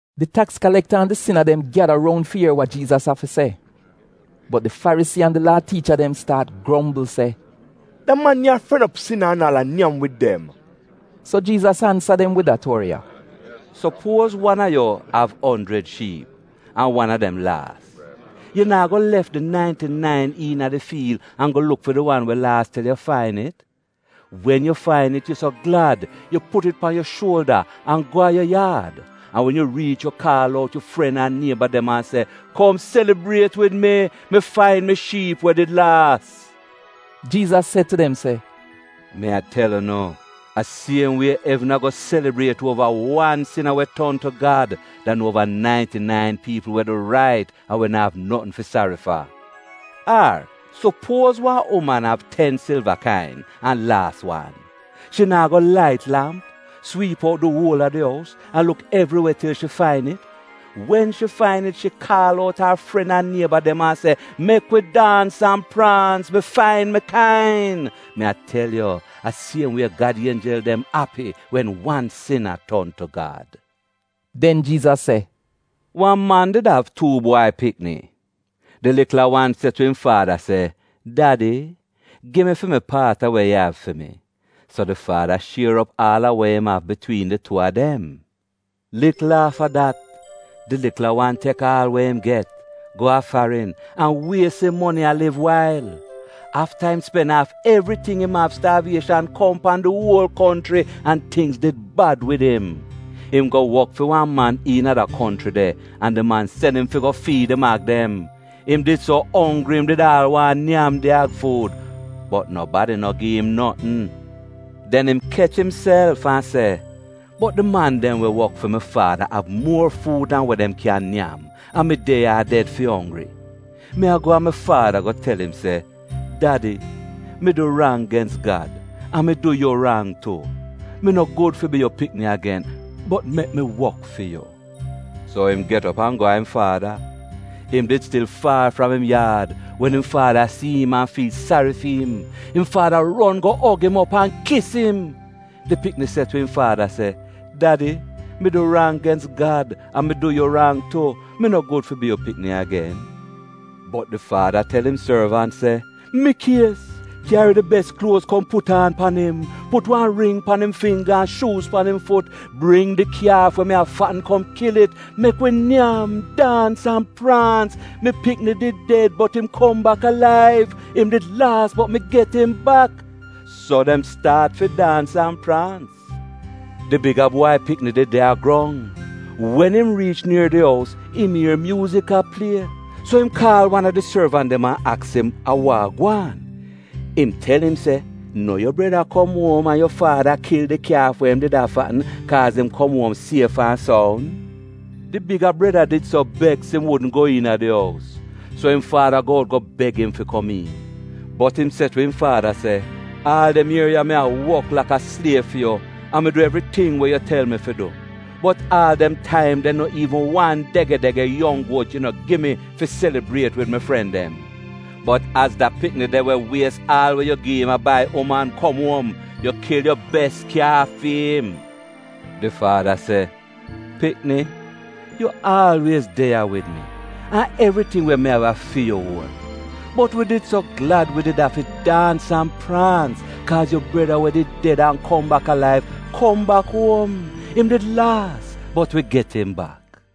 Di taks kalekta an di sina dem gyada roun fi ier wa Jiizas av fi se. Bot di Farisii an di Laa tiicha dem staat grombl se, “Da man ya a fren op sina an aal a nyam wid dem.” So Jiizas ansa dem wid da tuori ya: “Supuoz wan a yu av onjrid shiip an wan a dem laas. Yu naa go lef di nainti-nain iina di fiil an go luk fi di wan we laas til yu fain it? Wen yu fain it, yu so glad yu put it pan yu shuolda an go a yu yaad. An wen yu riich yu kaal out yu fren an nieba dem an se, ‘Kom selibriet wid mi, mi fain mi shiip we did laas.’” Jiizas se tu dem se, “Mi a tel unu, a siem wie evn ago selibriet uova wan sina we ton tu Gad dan uova nainti-nain piipl we du rait an we na'av notn fi sari fa. “Ar sopuoz wan uman av ten silva kain an laas wan. Shi naa go lait lamp, swiip out di uola di ous, an luk evri we til shi fain it? Wen shi fain it, shi kaal out ar fren an nieba dem an se, ‘Mek wi daans an praans, mi fain mi kain.’ Mi a tel yu a siem wie Gad ienjel dem api wen wan sina ton tu Gad.” Den Jiizas se, “Wan man did av tuu bwai pikini. Di likla wan se tu im faada se, ‘Dadi, gi mi fi mi paat a we yu av fi mi.’ So di faada shier op aal a we im av bitwiin di tuu a dem. “Likl afta dat, di likla wan tek aal we im get, go a farin, an wies im moni a liv wail. Afta im spen aaf evriting im av, staavieshan kom pan di uol konchri, an tingz did bad wid im. Im go wok fi wan man iina da konchri de an di man sen im fi go fiid im ag dem. Im did so onggri im did aal waahn nyam di ag fuud, bot nobadi no gi im notn. “Den im kech imself an se, ‘Bot di man dem we wok fi mi faada av muor fuud dan we dem kyan nyam an mi de ya a ded fi onggri! Mi a go a mi faada go tel im se: Dadi, mi du rang gens Gad an mi du yu rang tu, mi no gud fi bi yu pikni agen, bot mek mi wok fi yu.’ So im get op an go a im faada. Im did stil faar fram im yaad wen im faada si im an fiil sari fi im. Im faada ron go og im op an kis im. “Di pikni se tu im faada se, ‘Dadi, mi du rang gens Gad an mi du yu rang tu. Mi no gud fi bi yu pikni agen.’ “Bot di faada tel im sorvant se, ‘Mikies! Kyari di bes kluoz kom put aan pan im. Put wan ring pan im fingga an shuuz pan im fut. Bring di kyaaf we mi a fatn kom kil it. Mek wi nyam, daans an praans. Mi pikni did ded bot im kom bak alaiv. Im did laas bot mi get im bak.’ So dem staat fi daans an praans. “Di biga bwai pikini did de a grong. Wen im riich nier di ous, im ier myuuzik a plie. So im kaal wan a di sorvant dem an aks im a wa gwaan. Im tel im se ‘No yu breda kom uom an yu faada kil di kyaaf we im did a fatn, kaaz im kom uom sief an soun.’ “Di biga breda did so beks, im wudn go iina di ous. So im faada go out go beg im fi kom iin. Bot im se tu im faada se, ‘Aal dem ier ya mi wok laka sliev fi yu an mi du evriting we yu tel mi fi du. Bot aal dem taim de no iivn wan dege-dege yong guot yu no gi mi fi selibriet wid mi fren dem. Bot az da pikni de, we wies aal we yu gi im a bai uman, kom uom, yu kil yu bes kyaaf fi'im!’ “Di faada se, ‘Pikni, yu aalwiez de ya wid mi, an evriting we mi av a fi yu uon. Bot wi did so glad wi did afi daans an praans, kaaz yu breda we did ded an kom bak alaiv, kom bak uom. Im did laas bot wi get im bak.’”